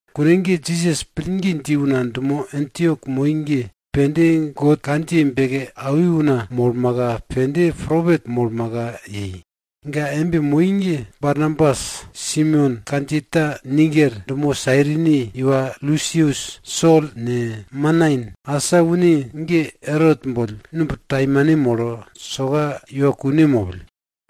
Kune ge Jisas pillgi dji una dumo Antiok moi ge, pende God kandjiye beke awi una molmaka, pende propet molmaka yei. Ga embe moi ge Barnabas, Simeon kandjiye ta Niger, dumo Sairini iwa Lusius, Sol ne, Manain. Asa une ge Erot boll numb taimane molo, soka iwa kune mopill.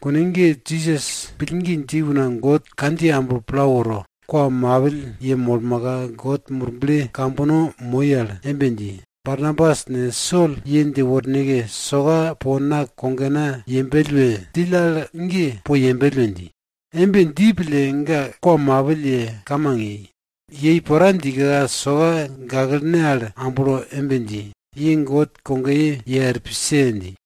Kune ge Jisas pillgi dji una God kandjiye amblo pla woro, kwa mapill yemolmaka, God Murble kambono moi al embe dji, Barnabas ne, Sol ye dje worneke, soka po na kogena yembell we djill al ge po yembell we dji. Embe dji pille, ga kwa mapill ye, kamang yei. Yei pora djika, soka gaklene al amblo embe dji, ye God kogoye ye er pise! dji.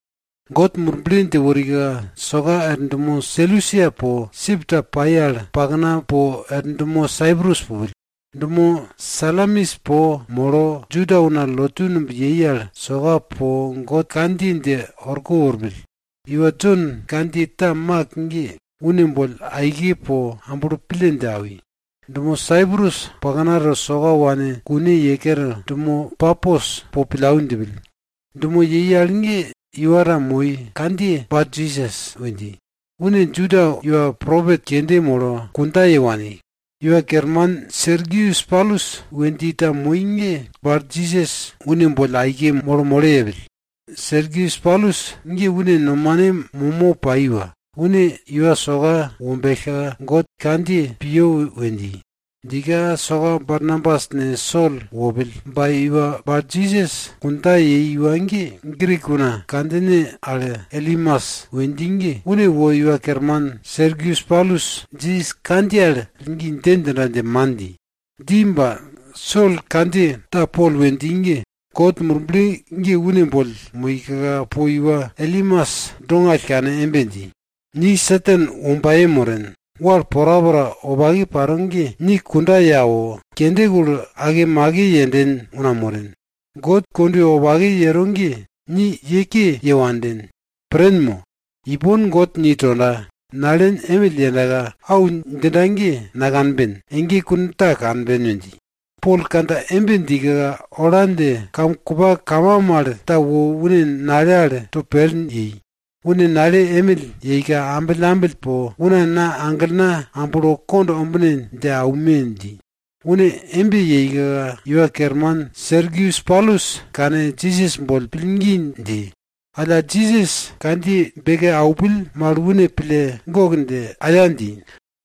God Murble dje worika, soka er dumo Selusia po, sip ta pai al pakna po er dumo Saiprus pupill. Dumo Salamis po molo, Juda una lotu numb yei al, soka po God kandjiye dje orko worpill. Iwa Jon kandjiye ta Mak ge, une boll aike po amblo pille dje awi. Dumo Saiprus paknato soka wane kune ye kere, dumo Papos po pillau djipill. Dumo yei al ge iwa ta moi, kandjiye Barjisas we dji. Une Juda iwa propet kende molo, kundja ye wani. Iwa kerman Sergius Paulus we dji ta moi ge Barjisas une boll aike molo molo yepill. Sergius Paulus ge une nomane momo pai iwa. Une iwa soka wombellka, God kandjiye piyo we dji. Djika soka Barnabas ne, Sol wopill. Ba iwa Barjisas kundja yei iwa ge, Grik una kandjine al Elimas we dji ge, une wo iwa kerman Sergius Paulus Jisas kandjiye al pillgi dje djinda dje man dji. Dji ba, Sol kandjiye ta Pol we dji ge, God Murble ge une boll moika, po iwa Elimas dongall kane embe dji, ni Satan wombaye moren. Wal porapora wopake paro ge, ni kunda ye awo, kende kulo, akemake yenden una moren. God kondwe wopake yero ge, ni ye ke ye wanden. Pren mo? Ipon God ni tonda, nalen emill yendaka, au djinda ge nakanben, ege kune ta kanben we dji. Pol kandja embe djika, ola dje kam kupa kama mal ta wo une nale al to pel yei. Une nale emill yeika, ambillambill po, una na aglena amblo kond ombine dje aume dji. Une embe yeika iwa kerman Sergius Paulus kane, Jisas boll pillgi dji. Alla Jisas kandjiye beke aupill mal une pille gok dje aya dji.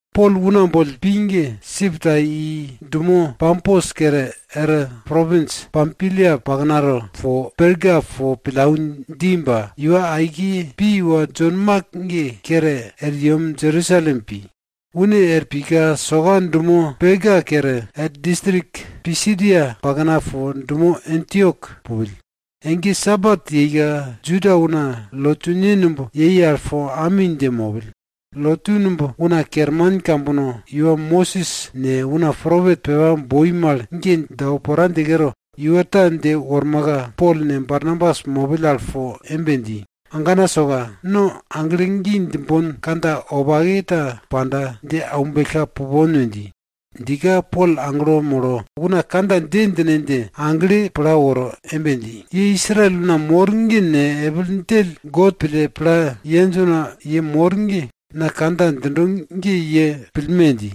Pol una boll pi ge, sip ta i dumo Papos kere er propins Pampilia paknato dumo Perga po pillau dji ba, iwa aike pi iwa Jon Mak ge kere er yem Jerusalem pi. Une er pika soka dumo Perga kere, er distrik Pisidia pakna po dumo Antiok pupill. Ege Sabat yeika, Juda una lotune numb yei al po ami dje mopill. Lotu numb una kerman kambono iwa Mosis ne, una propet pepa boi mal ge dje awo pora dje kere, iwa ta dje wormaka, Pol ne, Barnabas mopill al po embe dji, agana soka, no aglo gi djimbon kandja wopake ta panda, dje aumbellka pupon we dji. Djika, Pol aglo molo una kandja dje djine dje agle pla woro embe dji, ye Israel una mor ge ne, epil djell God pille pla yenj una ye mor ge, na kandja djindo ge ye pillme! dji.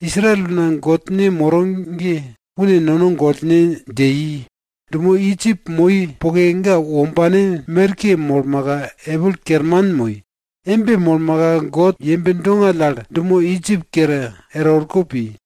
Israel una Godne moro ge, une nono gollne dje i. Dumo Idjip moi poke, ga wombane merke molmaka una epil kerman moi. Embe molmaka God yembe dongall al dumo Idjip kere er orko pi.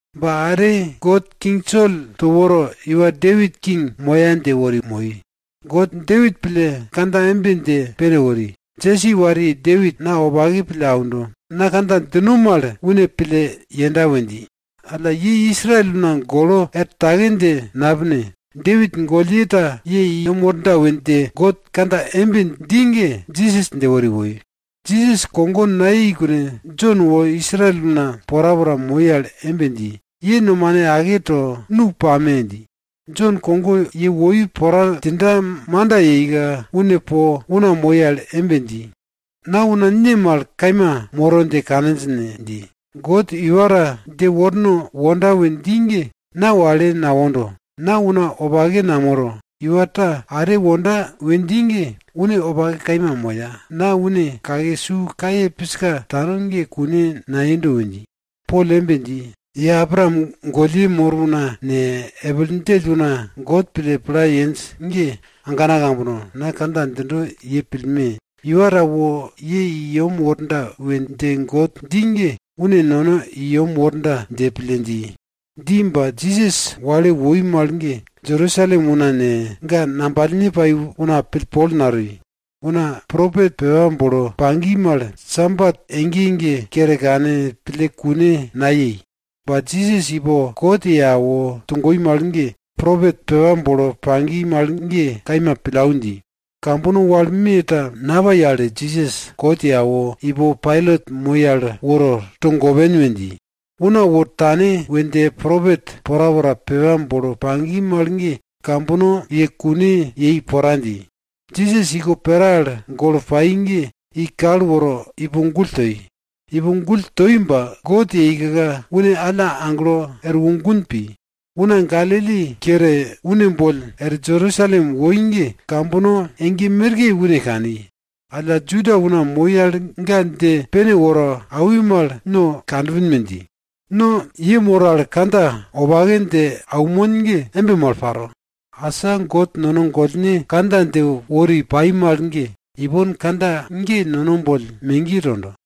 Ba are God king Sol to woro, iwa Depit king moya dje wori moi. God Depit pille kandja embe dje pene wori, Jesi wariye Depit na wopake pille aundo. Na kandja djino mal une pille yenda we dji. Alla ye Israel una golo er take dje napine, Depit gollye ta ye i yem worda we dje God kandja embe dji ge, Jisas dje wori woi. Jisas kogo nayei kune, Jon wo Israel una porapora moi al embe dji, ye nomane ake to, nu pame! dji. Jon kogo ye woi pora djinda manda yeika, une po una moi al embe dji, na una ne mal kaima moro dje kaninj ne? dji. God iwa ta dje worno wonda we dji ge, na wale nawondo. Na una wopake namoro, iwa ta are wonda we dji ge, une wopake kaima moya, na une kake su kaye piska tano ge kune nayendo we dji. Pol embe dji, ye Abraam gollye mor una ne, epil djell una God pille pla yenj ge, agana kambono, na kandja djindo ye pillme! Iwa ta wo ye i yem worda we dje God dji ge, une nono i yem worda dje pille dji. Dji ba, Jisas wale woi mal ge Jerusalem una ne, ga ngambalne pai una pillpol natoi. Una propet pepa bolo pagi mal, Sabat ege ege kere kane pille kune nayei. Ba Jisas ipo kot ye awo togoi mal ge, propet pepa bolo pagi mal ge kaima pillau dji. Kambono wal me ta napai al Jisas kot ye awo, ipo Pailat moi al woro, togopen we dji. Una wo tane we dje propet porapora pepa bolo pagi mal ge, kambono ye kune yei pora dji. Jisas iko pera al golo pai ge i kal woro, ipo gull toi. Ipo gull toi ba, God yeika, une alla aglo erwo gun pi. Una Galili kere une boll er Jerusalem woi ge, kambono ege merke une kani. Alla Juda una moi al ga dje pene woro awi mal, no kanpin we dji. No ye mor al kandja wopake dje aunmon ge embe mal paro. Asa God nono gollne kandja dje wori pai mal ge, ipon kandja ge nono boll megiye tondo.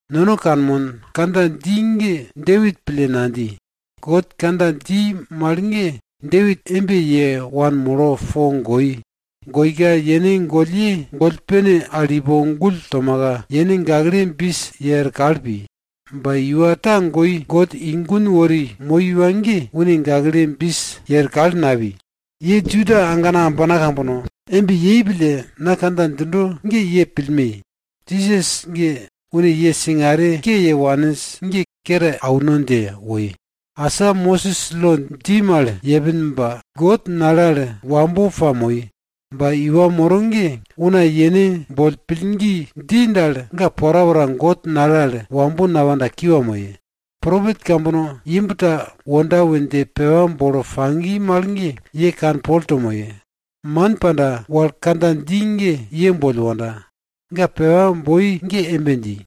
Nono kanmon, kandja dji ge Depit pille nadji. God kandja dji mal ge Depit embe ye wanmolo po goi. Goika yene gollye goll pene al ipo gull tomaka, yene gakle bis ye er kal pi. Ba iwa ta goi, God i gun wori moi iwa ge, une gakle bis ye er kal napi. Ye Juda agana ambana kambono, embe yei pille, na kandja djindo ge ye pillme! Jisas ge, une ye singare ke ye waninj ge kere auno dje woi. Asa Mosis lo dji mal yepin ba, God nale al wambo pamoi. Ba iwa moro ge, una yene boll pillgi dji dal, ga porapora God nale al wambo napanda, kiwa moye. Propet kambono imb ta wonda we dje pepa bolo pagi mal ge, ye kanpol to moye! Man panda, wal kandja dji ge ye boll wonda! Ga pepa boi ge embe dji,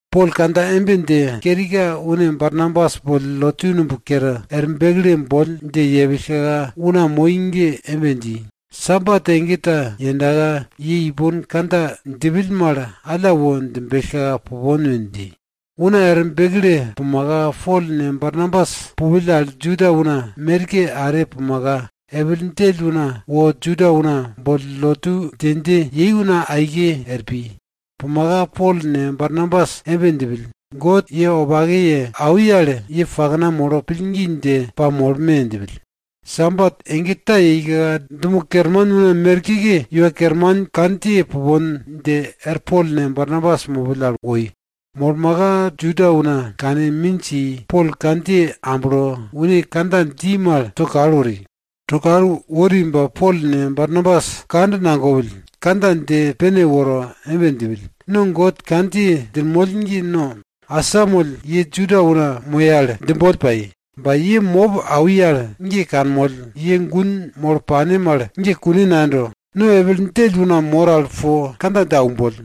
Pol kandja embe dje kerika, une Barnabas boll lotu numb kere er bekle boll dje yepillka, una moi ge embe dji, Sabat ege ta yendaka, ye ipon kandja djipill mal, alla wo djimbellka pupon we dji. Una er bekle pumaka, Pol ne, Barnabas pupill al Juda una merke are pumaka, epil djell una wo Juda una boll lotu dje dje yei una aike are pi. Pumaka, Pol ne Barnabas embe djipill, God ye wopake ye awi al ye pakna molo pillgi dje pamolme! djipill. Sabat ege ta yeika, dumo kerman una merkeke Iwa Kerman kandjiye pupon dje er Pol ne, Barnabas mopill al woi. Wo molmaka, Juda una kane minj i, Pol kandjiye amblo, une kandja dji mal to kal wori. To kal wori ba Pol ne, Barnabas kand nagopill, kandja dje pene woro embe djipill, no God kandjiye djinmoll ge, no asamoll ye Juda una moye al djimboll pai. Ba ye mop awi al ge kanmoll, ye gun molo pane mal ge kune nayendo. No epil djell una mor al po kandja dje aumboll!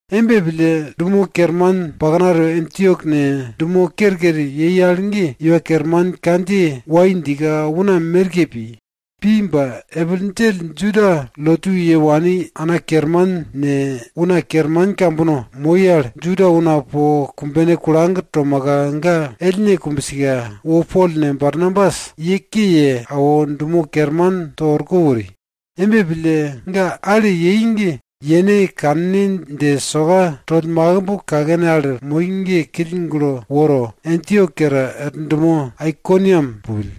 Embe pille, dumo kerman paknato Antiok ne, dumo kerker yei al ge, Iwa Kerman kandjiye wai djika una merke pi. Pi ba, epil djell Juda lotu ye wani ana kerman ne, una kerman kambono moi al, Juda una po kumbene kulag tomaka ga ellne kumbsika, wo Pol ne, Barnabas ye ke ye awo, dumo kerman to orko wori. Embe pille, ga ale yei ge yene kanne dje soka toll makimb kakene al moi ge kill gulo woro, Antiok kere er dumo Aikoniam pupill.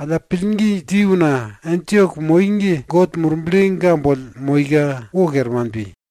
Alla pillgi dji una Antiok moi ge, God Murble ga boll moika, wo kerman pi.